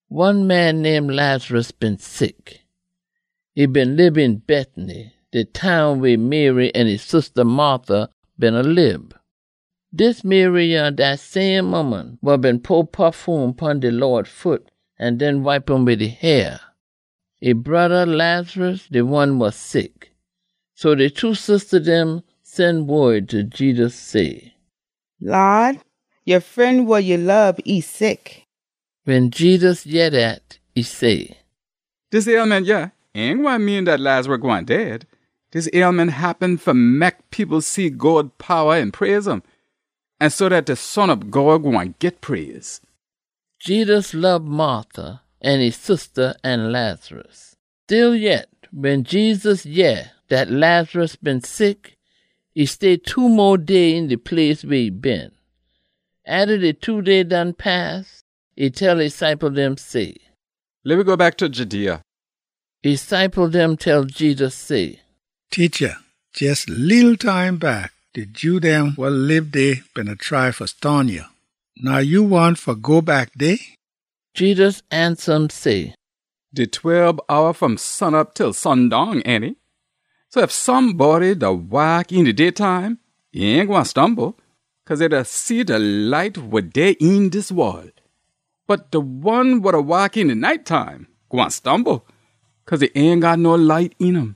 One man name Lazarus been sick. E beena lib een Bethany, de town weh Mary an e sista Martha beena lib. Dis Mary yah dat same ooman wa been pour pafume pon de Lawd foot an den wipe um wid e hair. E broda, Lazarus, de one wa sick. So de two sista dem sen wod ta Jedus say, “Lawd, ya fren wa ya lob, e sick.” Wen Jedus yeh dat, e say, “Dis ailment yah ain gwine mean dat Lazarus gwine dead. Dis ailment happen fa mek people see God powa an praise um, an so dat de Son ob God gwine git praise.” Jedus lob Martha an e sista an Lazarus. Stillyet, wen Jedus yeh dat Lazarus been sick, e stay two mo day een de place weh e been. Atta de two day done pass, e tell e ciple dem say, “Leh we go back ta Judea.” E ciple dem tell Jedus say, “Teacha, jes a leetle time back, de Jew dem wa lib dey beena try fa stone ya. Now ya wahn fa go back dey?” Jedus ansa um say, “Dey tweb hour fom sunop til sundown, ainty? So ef somebody da waak een de daytime, e ain gwine stumble, cause e da see de light wa dey een dis wol. Bot de one wa da waak een de night time gwine stumble, cause e ain got no light een um.”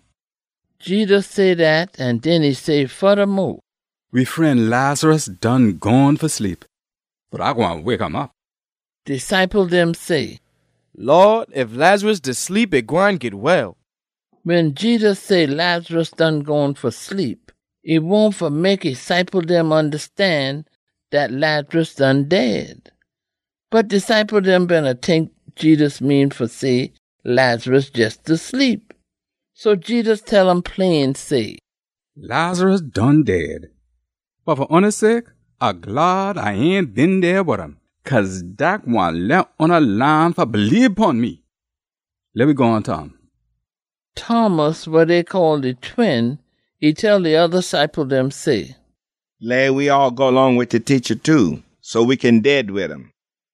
Jedus say dat an den e say fodamo, “We fren, Lazarus, done gone fa sleep, bot A gwine wake um op.” De ciple dem say, “Lawd, ef Lazarus da sleep, e gwine git well.” Wen Jedus say Lazarus done gone fa sleep, e wahn fa mek e ciple dem ondastan dat Lazarus done dead. Bot de ciple dem beena tink Jedus mean fa say Lazarus jes da sleep. So Jedus tell um plain say, “Lazarus done dead. Bot fa oona sake, A glad A ain been dey wid um, cause dat gwine leh oona laan fa bleebe pon me. Leh we gone ta um.” Thomas, wa dey call de Twin, e tell de oda ciple dem say, “Leh we all go long wid de Teacha too, so we kin dead wid um.”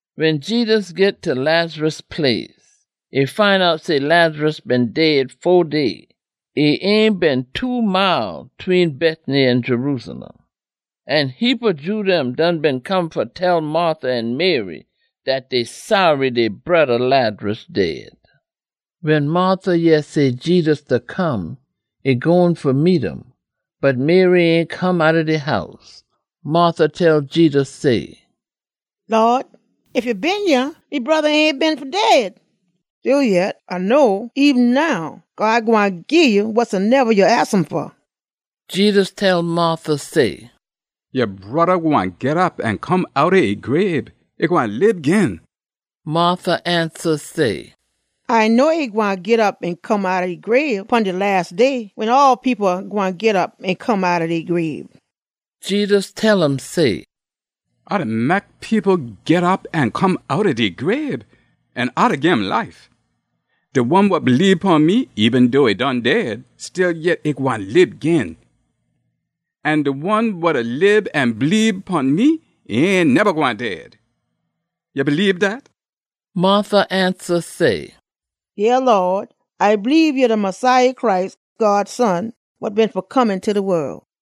Wen Jedus git ta Lazarus place, e find out say Lazarus been dead fo day. E ain been two mile tween Bethany an Jerusalem. An heapa Jew dem done been come fa tell Martha an Mary dat dey saary dey broda Lazarus dead. Wen Martha yeh say Jedus da come, e gone fa meet um. Bot Mary ain come outta de house. Martha tell Jedus say, “Lawd, ef ya been yah, me broda ain been fa dead! Stillyet A know, eben now God gwine gii ya wasoneba ya aks um fa.” Jedus tell Martha say, “Ya broda gwine git op an come outta e grabe. E gwine lib gin.” Martha ansa say, “A know e gwine git op an come outta e grabe pon de las day, wen all people gwine git op an come outta dey grabe.” Jedus tell um say, “A da mek people git op an come outta dey grabe, an A da gim life. De one wa bleebe pon me, eben dough e done dead, stillyet e gwine lib gin. An de one wa da lib an bleebe pon me, e ain neba gwine dead. Ya bleebe dat?” Martha ansa say, “Yeah, Lawd, A bleebe ya de Messiah Christ, God Son, wa been fa come eenta de wol.”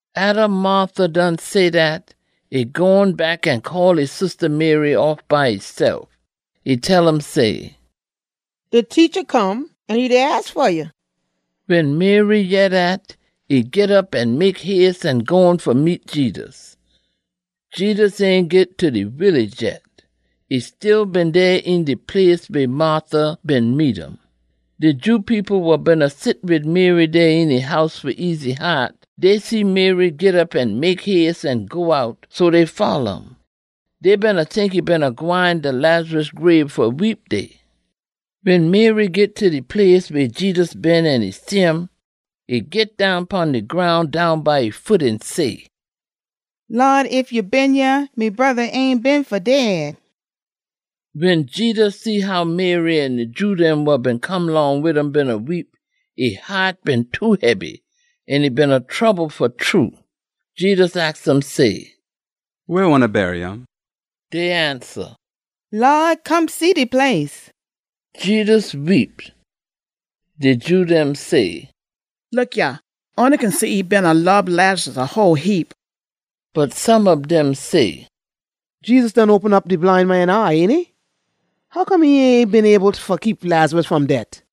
Atta Martha done say dat, e gone back an call e sista Mary off by esef. E tell um say, “De Teacha come an e da aks fa ya.” Wen Mary yeh dat, e git op an mek hace an gone fa meet Jedus. Jedus ain git ta de willage yet. E still been dey een de place weh Martha been meet um. De Jew people wa beena sit wid Mary dey een e house fa ease e haat, dey see Mary git op an mek hace an go out, so dey folla um. Dey beena tink e beena gwine ta Lazarus grabe fa weep dey. Wen Mary git ta de place weh Jedus been an e shim, e git down pon de groun down by e foot an say, “Lawd, ef ya been yah, me broda ain been fa dead!” Wen Jedus see how Mary an de Jew dem wa been come long wid um beena weep, e haat been too hebby an e beena trouble fa true. Jedus aks um say, “Weh oona bury um?” Dey ansa, “Lawd, come see de place.” Jedus weep. De Jew dem say, “Look yah, oona kin see e beena lob Lazarus a whole heap!” Bot some ob dem say, “Jedus done open op de bline man eye, ainty? Hoccome e ain been able fa keep Lazarus fom det?”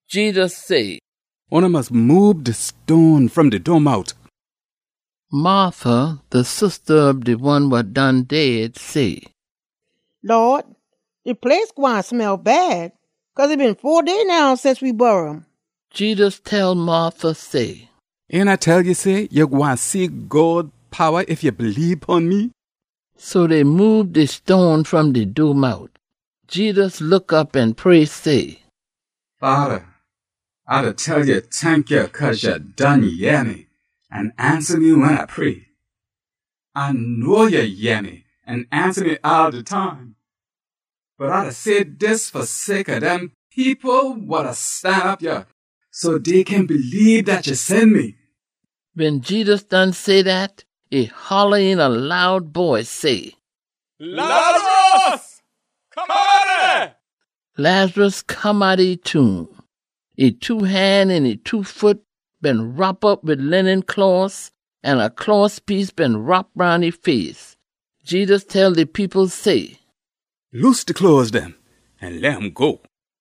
Jedus say, “Oona mus moob de stone fom de doormout!” Martha, de sista ob de one wa done dead, say, “Lawd, de place gwine smell bad, cause e been fo day now since we bury um!” Jedus tell Martha say, “Ain A tell ya say, ya gwine see God powa ef ya bleebe pon me?” So dey moob de stone fom de doormout. Jedus look op an pray say, “Fada, A da tell ya tankya cause ya done yeh me an ansa me wen A pray. A know ya yeh me an ansa me all de time. Bot A da say dis fa sake ob dem people wa da stanop yah, so dey kin bleebe dat ya sen me.” Wen Jedus done say dat, e holla een a loud boice say, “Lazarus, come outta dey!” Lazarus come outta e tomb. E two han an e two foot been wrop op wid linen closs an a closs piece been wrop roun e face. Jedus tell de people say, “Loose de closs dem an leh um go.”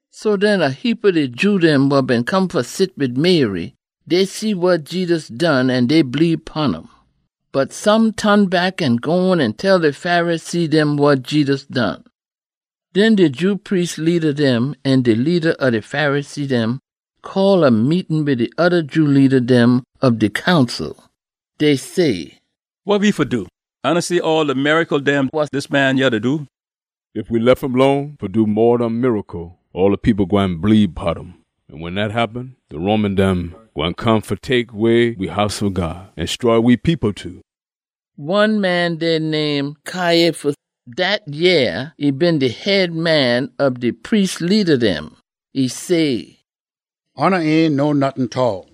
So den a heapa de Jew dem wa been come fa sit wid Mary, dey see wa Jedus done an dey bleebe pon um. Bot some ton back an gone an tell de Pharisee dem wa Jedus done. Den de Jew priest leada dem an de leada ob de Pharisee dem call a meetin wid de oda Jew leada dem ob de Council. Dey say, “Wa we fa do? Oona see all de miracle dem wa dis man yah da do? Ef we lef um lone fa do mo ob dem miracle, all de people gwine bleebe pon um. An wen dat happen, de Roman dem gwine come fa tek way we House ob God, an stroy we people too.” One man dey name Caiaphas. Dat yeah e been de head man ob de priest leada dem. E say, “Oona ain know nottin tall!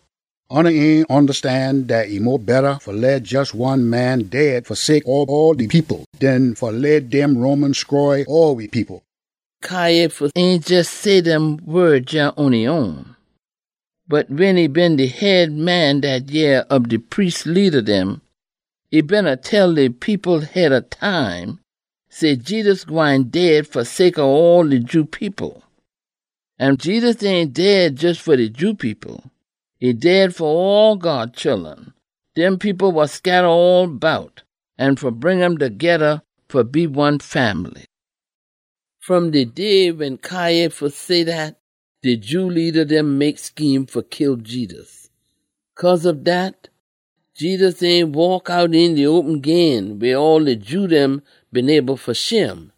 Oona ain ondastan dat e mo betta fa leh jes one man dead fa sake ob all de people, den fa leh dem Roman stroy all we people!” Caiaphas ain jes say dem wod yah on e own, bot wen e been de head man dat yeah ob de priest leada dem, e beena tell de people head ob time, say Jedus gwine dead fa sake ob all de Jew people. An Jedus ain dead jes fa de Jew people. E dead fa all God chullun, dem people wa scatta all bout, an fa bring um togeda fa be one fambly. Fom de day wen Caiaphas say dat, de Jew leada dem mek scheme fa kill Jedus. Cause ob dat, Jedus ain waak out een de open gin weh all de Jew dem been able fa shim.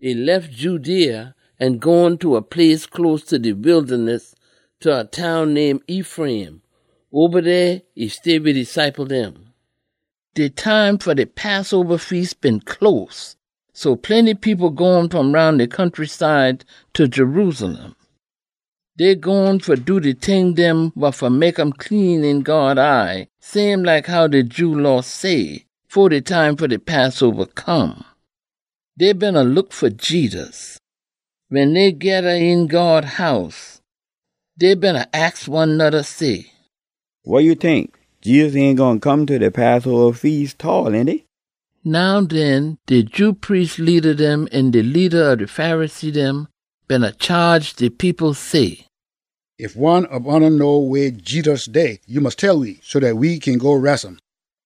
E lef Judea an gone ta a place close ta de wildaness, ta a town name Ephraim. Oba dey e stay wid e ciple dem. De time fa de Passoba Feas been close, so plenty people gone fom roun de countryside ta Jerusalem. Dey gone fa do de ting dem wa fa mek um clean een God eye same like how de Jew Law say, fo de time fa de Passoba come. Dey beena look fa Jedus. Wen dey geda een God House, dey beena aks one noda say, “Wa ya tink? Jedus ain gwine come ta de Passoba Feas tall, ainty?” Now den, de Jew priest leada dem an de leada ob de Pharisee dem beena chaage de people say, “Ef one ob oona know weh Jedus dey, ya mus tell we, so dat we kin go res um.”